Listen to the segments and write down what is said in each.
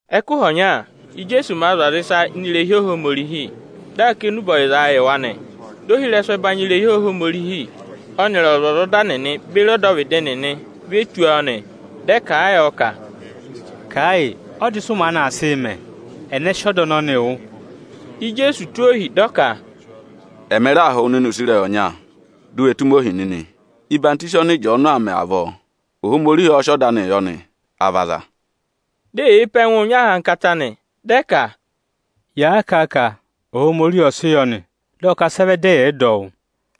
Ẹkụhị ọnya, Íjeesu màa zụ̀ aza ịsa ini irehi Ohomorihi, dị aa kà enube ọyịzaa yị wa nị. Ohirẹsụ ẹbanyị irehi Ohomorihi ọnịrị ọzwọzọda nịnị beri ọdọvịdị nịnị ê ve tù, dị ẹ kà a yọ ka, “Kà ẹ yị, ọda ịsị ụ maanị aa sịị mẹ? Ẹnẹ sị ọda ọnọnịị wụ?” Di Ijeesu tụ́ ohi, dị ọ ka, “Ẹmị raa họ̀ wụ nịnị use ịrẹyị ọnya: di u we tụ́ mi ohi nịnị! Ọyịhwọzenyi ọnị Ịjọọnụ aa mẹ avọọ, Ohomorihi ọ́ọ́ sị ọda anịị yọ nị, à vị aza?” Di eyee pe ẹngụ nyị ahankata nị, dị ẹ ka, “Yàa kà a ka: ‘Ohomorihi ọ sị yọ nị’, dị ọ ka sị ẹ vẹ dị ẹyị ẹ̀ yị dọ ọ wụ́?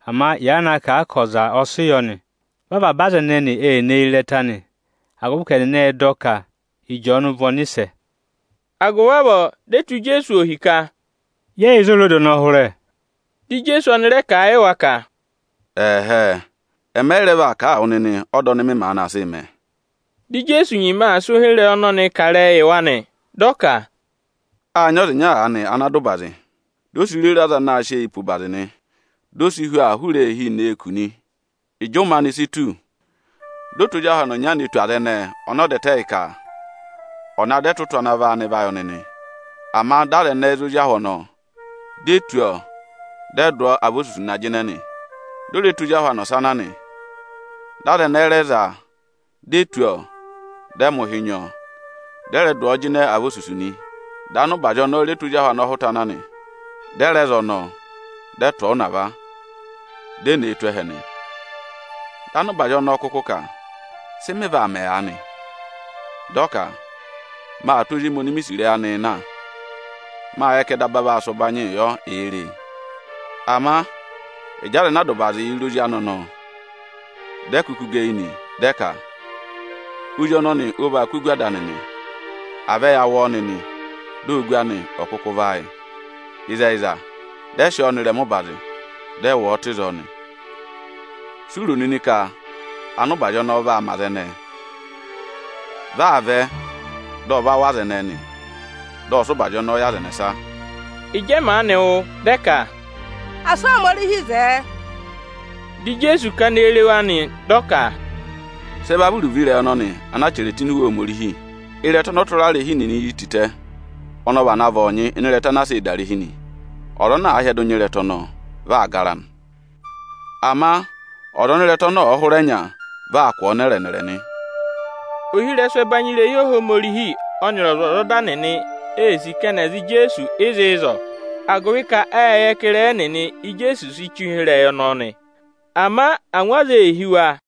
Ama yàa na kà a ka ọza ọ sị yọ nị, vị avaba aza ẹnẹnị ee ne yi ịrẹta nị, agụvị ka ẹnịnị ệ dọ ka Ịjọọnụ vị ọnịsẹ.” Agụvị avọọ, di e tụ́ Ijeesu ohi ka, “Yẹ yị yẹ ịzị o re ọda ọnọọ hụrẹ.” Dị Ijeesu ọnị rẹ kà a yị wa ka, “Ẹ̀hẹẹ, ẹmị ẹ yị rẹ vaa kà a wụ nịnị ọda ọnị mị maanị aa sịị mẹ.” Dị Ijeesu nyima aa sị ụhịrẹyị ọnọnịị kà ịrẹyị yị wa nị. Dị ọ ka, “Â nyị ọza ịnya aanị ana dà ụbazị, di o si rere aza anaā sịị eyii pe ụbazị nị. Di o si hu aa hụrẹ eehi nee kù nị. Ịjị ụmẹ si tù ka à kụ́ ẹtụtụ gụ, dị ọ tụ́ ozi ahụ anị ọnya ne tù aza ẹnẹẹ ọnị ọ dà ẹtẹ yị ka ọ̀ na dọ ẹtụtụ ana vị áanị va yị ọnị nị. Ama aza ẹnẹẹ ệ za ozi ahụ ọnọọ, di e tụ́ ọọ, dị ẹ dụ ọọ avosusu na jịnẹ nị. Dị ọ rẹ tụ́ ozi ahụ anị ọsa na nị. Dị aza ẹnẹẹ rẹ za a, di e tụ́ ọọ, dị ẹ mẹ̀ ụhị nyị ọọ, dị ẹ rẹ dụ ọọ jịnẹ avosusu nị. Dị ọza ana nyị ụbazị ọnọọ rẹ tụ́ ozi ahụ anị ọhụta na nị. Dị ẹ rẹ za ọnọọ, dị ẹ tụ̀ ọ ụnava, dị ẹ tụ ọ ụvọ tụ́ ẹhẹ nị. Dị ọza ana nyị ụbazị ọnọọ kụkụ ka: ‘Sị mị vaa mẹ aanị?’ Dị ọ ka: ‘Maa tụ́ ozi emi oni mi sì ịrẹyị anịị na. Mâ yẹ ka ẹ daba vaa sị ụbanyịị yọ, èe re e.’ Ama ịjị aza ana a dà ụbazị yị re ozi anị ọnọọ, dị ẹ kụkụ gẹ eyi nị, dị ẹ ka: ‘Ozi ọnọnị ọ vaa kụ́ ogu ada anị nị; à vẹ ya wụ ọọ nịnị, di ogu anị ò kụkụ vị áayị!’ Ịzẹyịza, dị ẹ sị ọọ nọ ịrẹma ụbazị, dị ẹ wụ̀ ọ tụ́ ịzọọ nị. Si u ro nịnị ka ọza ana nyị ụbazị ọnọọ vaa mẹ aza ẹnẹẹ? Vị aa vẹ, dị ọ va wụ̀ aza ẹnẹẹ nị, dị ọ sị ụbazị ọnọọ yị aza ẹnẹsa.” Ịjị ẹ maanị wụ́, dị ẹ ka, “Asị Ohomorihi zẹẹ!” Di Ijeesu kana eyi re wa nị, dị ọ ka, “Sị ẹ va vị iruvo ịrẹyị ọnọnị ana a chẹrẹ tụ́ ini Iwe Ohomorihi? ‘Ịrẹta ọnị ọtụrarehi nịnị yi tịtẹ, ọnị ọ vana vị ọọnyị ịnị ịrẹta ana a sịị̄ dà irehi nị.’ Ọza ana àa hyẹdụ nya ịrẹta ọnọọ, vị aa gara nị. Ama ọza ọnị ịrẹta ọnọọ ọ̀ọ hụrẹ nya, vị aa kụ̀ ọọ nẹrẹ-nẹrẹ nị.” Ohirẹsụ ẹbanyị irehi Ohomorihi ọnịrị ọzwọzọda nịnị ê sì ka ẹnị è za Ijeesu ịzị ịzọọ, agụvị ka ịrẹyị ẹnịnị Íjeesu si che ụhịrẹyị ọnọọ nị. Ama angwa aza ee hí wa.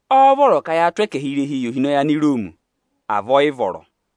Ọ́ọ́ vọrọ ka yaa tụ́ ẹkẹhị irehii yị ohinọyị Aniroomi, à vị ọ yị vọrọ?”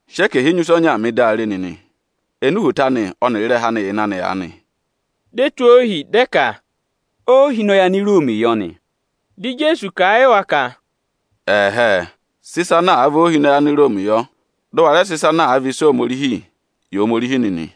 Sị ẹkẹhị enyusẹ ọnyaa mị, di a re nịnị! Ẹnị uhwoto anị ọnịrị ịrẹha anị yà ịnị anị aanị?” Di e tụ́ ohi dị ẹ ka, “Óohinọyị Aniroomi yọ nị.” Dị Ijeesu kà a yị wa ka, “Ẹ̀hẹẹ, sị ịsa ana àa vị óohinọyị Aniroomi yọ! Dị ụ wa rẹ sị ịsa ana àa vị ịsa Ohomorihi, yị Ohomorihi nịnị!”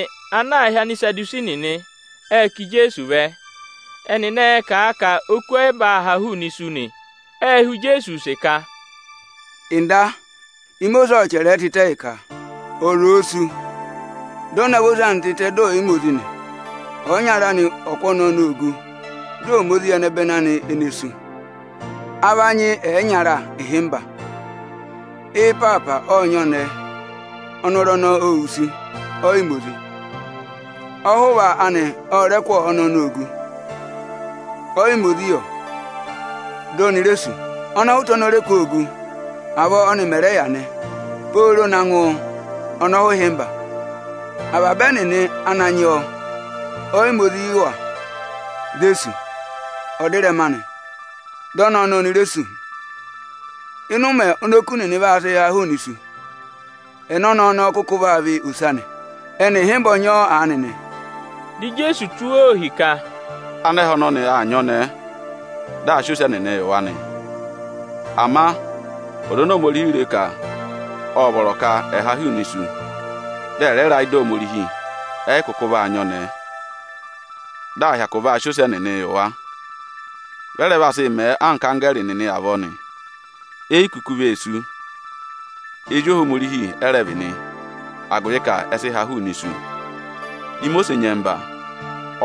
Aza ẹnyị aanị ana aā hị́ Anisadusi nịnị, ệ ká Ijeesu vẹ. Ẹnịnị ẹẹ̄ kà a ka oku ọ yị vaa haa hụụnị isu nị. Ệ họ̀ Ijeesu use ka: “Nda, Imosiisi ộ chẹrẹ ẹ tịtẹ yị ka, ọza òo sú, dị ọ navọ ose anị tịtẹ dị ọ̀ yị ma ozi nị, ọyịnyara anị ọ̀ kụ́ ọnẹẹ ọnọọ ogu, dị ọ̀ ma ozi yị ẹnẹbẹnị anị ene sú. A va nyị ẹyịnyara ịhịmba. Ị́ịpaapa ộ nyị ọnẹẹ, ọnọrụ ọnọọ ô wusu, ọ yị ma ozi. Ọhụva anị ọ rẹ kụ́ ọnẹẹ ọnọọ ogu, ọ yị ma ozi yọ, di oni re sú. Ọnọhụta ọnị ọ rẹ kụ́ ọọ ogu, avọọ ọ́nị mẹ̀ rẹ yà nị, pooro naa ngụ ọnọhụhịmba. Ộ yị ma ozi yị avaba ẹnịnị ana nyị ọọ, di e sú. Ọdịrẹma anị, dị ọnẹẹ ọnọọ oni re sú nị. Ịnị ụmẹ oni oku nịnị vaa sị haa hụụnị isu, ẹnẹ ọnẹẹ ọnọọ kụkụ vaa vị ose anị? Ẹnị ịhịmba ọ nyị ọọ aanị nị.” Dị Ijeesu tụ́ wa ohi ka, “Anẹhẹ ọnọnị aa nyị ọnẹẹ, dị ẹyaa va ọnọrụ nị. Ama aza oni Ohomorihi re ka ộ vọrọ ka ẹ̀ ha hụụnị isu, dị ẹ̀ rẹ ra ị́dị Ohomorihi, ẹ yị kụkụ vaa nyị ọnẹẹ, dị à hyakụ va sị aza ẹnyị gà ọnọrụ. Vị ẹ rẹ vaa sị mẹẹ anka anggẹẹrị nịnị avọọ nị, e yi kuku vee sú. Ezi Ohomorihi ẹ rẹ vị nị, agụvị ka ẹ sị ha hụụnị isu. Imosiisi nyẹmba,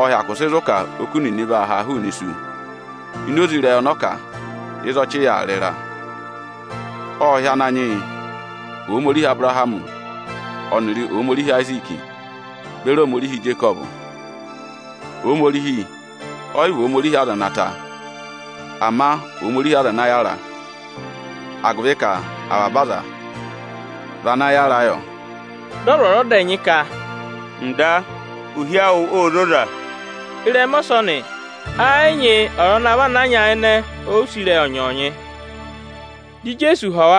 ộ hyakụ sị zụ̀ ka oku nịnị vaa ha hụụnị isu ini oze ịrẹyị ọnọọ kà ịzị avị yà aa rị ịra; ộ hị́ Ananyị yị ‘Ohomorihi Abụrahamị ọnịrị Ohomorihi Ayiziiki beri Ohomorihi Ijekọvụ.’ Ohomorihi ọ yị vị Ohomorihi aza ene wusu, ama Ohomorihi aza ana yàra; agụvị ka avaba aza vị ana yàra yọ.” Dị ọzwọzọda ẹnyị ka, “Nda, ohi awụ ô zoza.” Ịrẹma ọsọnị ẹ yị nyị ọza ana vana nyayịnẹ họ̀ ọ use ịrẹyị ọnyọọnyị. Ẹ̀nị Ikirisiti vị ozi anị?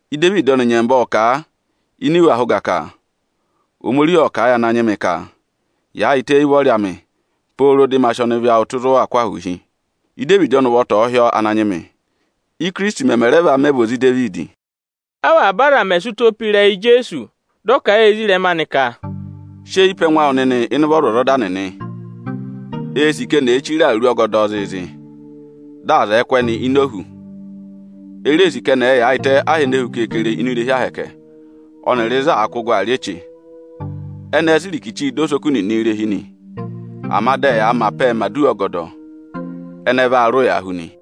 Idevidi ọnị nyẹmba ộ kà a ini iwe ahẹ ụga ka: ‘Ohomorihi ộ kà a yị Ananyị mị ka: Yaayịtẹ éyi ụvọrị amị pooro dị ma sị ọnịvị awụ tụ́ ịzị ụ waa kụ́ ahụụ hi!’ Idevidi ọnị ụvọta ộ hị́ ọọ Ananyị mị, Íkirisiti mẹmẹ rẹ va mẹ vị ozi Idevidi?” Avaba aza mẹ̀ sị ụtọ pe ịrẹyị Ijeesu, dị ọ kà a yị ezirẹma anị ka: “Sị eyi pe ẹnụ awụ nịnị ịnị ụvọ ọzwọzọda nịnị. Eē sì ka eni èe chire awuru ọgọdọọ zịịzị, dị aza ẹ̀ẹ kụ́ ẹnị ini ohu. E reē sì ka ẹnị ẹ̀ẹ yaayịtẹ aha ene hu keekere ini irehi Ohomorihi ọnịrị ịzị àa kụ́ gụ aa rị eche. Ẹnị ẹẹ̄ sị irikichi dọ osoku nịnị irehi nị, ama dị ẹyaa mẹ apẹẹ mẹ̀ aduwa ọgọdọ. Ẹnị ẹ vaa rị ụya hu nị.”